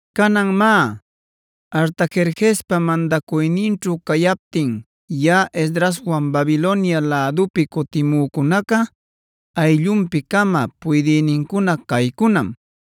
Canan má, Artajerjespa mandacuyninćhu cayaptin yaꞌa Esdraswan Babilonia lädupi cutimücunaca ayllunpi-cama puydïnincuna caycunam: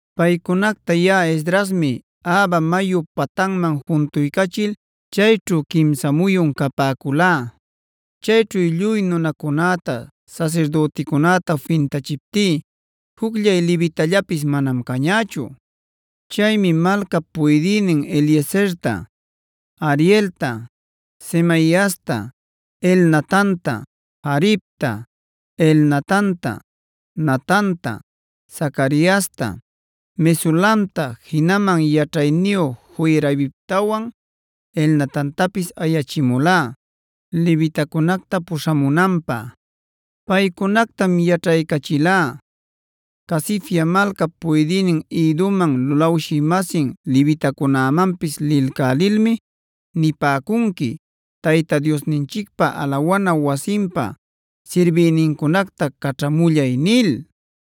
Paycunacta yaꞌa Esdrasmi Ahava mayu patanman juntuycachil chayćhu quimsa muyun capäculá. Chayćhu lluy nunacunäta sasirdüticunäta fintachiptí jucllay levitallapis manam cañächu. Chaymi malcap puydïnin Eliezerta, Arielta, Semaiasta, Elnatanta, Jaribta, Elnatanta, Natanta, Zacariasta, Mesulamta jinaman yaćhayniyu Joiaribtawan Elnatantapis ayachimulá levitacunacta puśhamunanpä. Paycunactam yaćhaycachilá: “Casifia malcap puydïnin Iddoman lulawshï-masin levitacunämanpis lilcälilmi nipäcunqui: ‘Tayta Diosninchicpa alawana wasinpa sirbïnincunacta caćhamullay’” nil.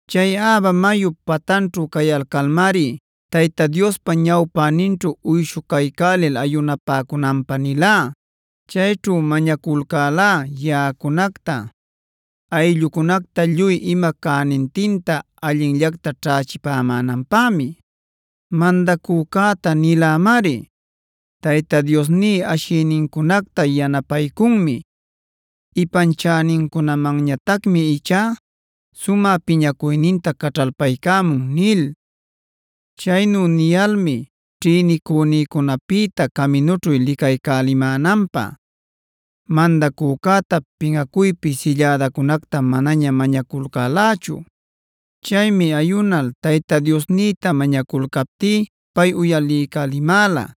Chay Ahava mayup patanćhu cayalcalmari Tayta Diospa ñawpäninćhu uyshucaycälil ayunapäcunäpä nilá. Chayćhu mañaculcälá yaꞌacunacta, ayllücunacta lluy ima cänintinta allinllacta ćhächipämänanpämi. Mandacücäta nilämari: “Tayta Diosní ashïnincunacta yanapaycunmi. Ipanchänincunamanñatacmi ichá sumä piñacuyninta caćhalpaycamun” nil. Chaynu niyalmi ćhïnicunïcunapïta caminućhu licaycälimänanpä, mandacücäta pinꞌacuypi sillädancunacta manaña mañaculcälächu. Chaymi ayunal Tayta Diosnïta mañaculcaptí pay uyaliycälimäla.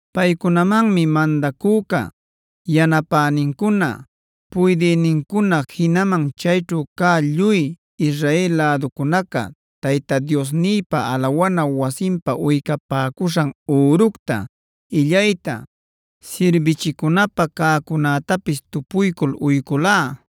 Paycunamanmi mandacüca, yanapänincuna, puydïnincuna jinaman chayćhu cä lluy Israel läducunaca Tayta Diosnïpa alawana wasinpä uycapäcuśhan üructa, illayta, sirbichicunapä cäcunätapis tupuycul uyculá.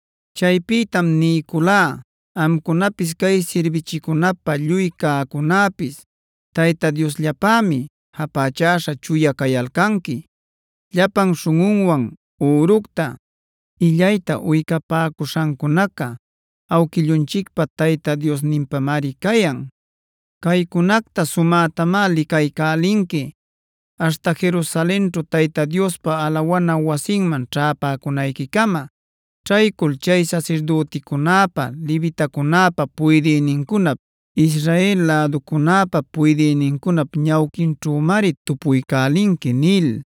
Chaypïtam niyculá: “Amcunapis cay sirbichicunapä lluy cäcunäpis Tayta Diosllapämi japächäśha chuya cayalcanqui. Llapan śhunꞌunwan üructa, illayta uycapäcuśhancunaca awquillunchicpa Tayta Diosninpämari cayan. Caycunacta sumätamá licaycälinqui aśhta Jerusalenćhu Tayta Diospa alawana wasiman ćhäpäcunayquicama. Ćhaycul chay sasirdüticunäpa levitacunäpa puydïnincunap, Israel läducunäpa puydïnincunap ñawquinćhümari tupuycälinqui” nil.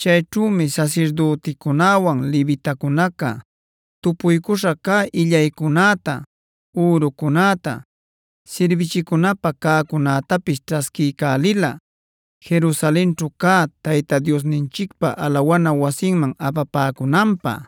Chayćhümi sasirdüticunäwan levitacunaca tupuycuśha cä illaycunäta, ürucunäta, sirbichicunapä cäcunätapis ćhasquiycälila, Jerusalenćhu cä Tayta Diosninchicpa alawana wasinman apapäcunanpä.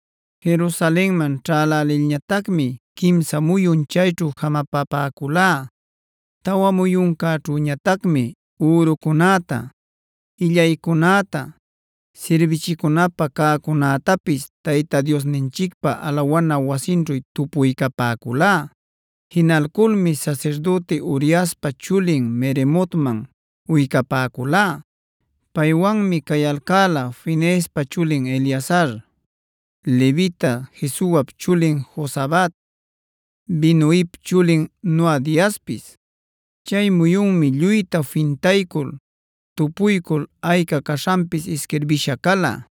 Jerusalenman ćhälälilñatacmi quimsa muyun chayćhu jamapapäculá. Tawa muyuncäćhüñatacmi ürucunäta, illaycunäta, sirbichicunapä cäcunätapis Tayta Diosninchicpa alawana wasinćhu tupuycapäculá. Jinalculmi sasirdüti Uriaspa chulin Meremotman uycapäculá. Paywanmi cayalcäla Fineespa chulin Eleazar, levita Jesuap chulin Jozabad, Binuip chulin Noadiaspis. Chay muyunmi lluyta fintaycul, tupuycul ayca caśhanpis isquirbisha cala.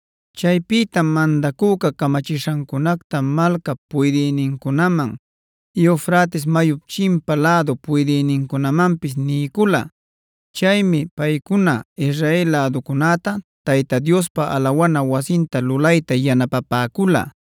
Chaypïtam mandacüca camachishancunacta malcap puydïnincunaman, Eufrates mayup chimpa lädu puydïnincunamanpis niycula. Chaymi paycuna Israel läducunäta Tayta Diospa alawana wasinta lulayta yanapapäcula.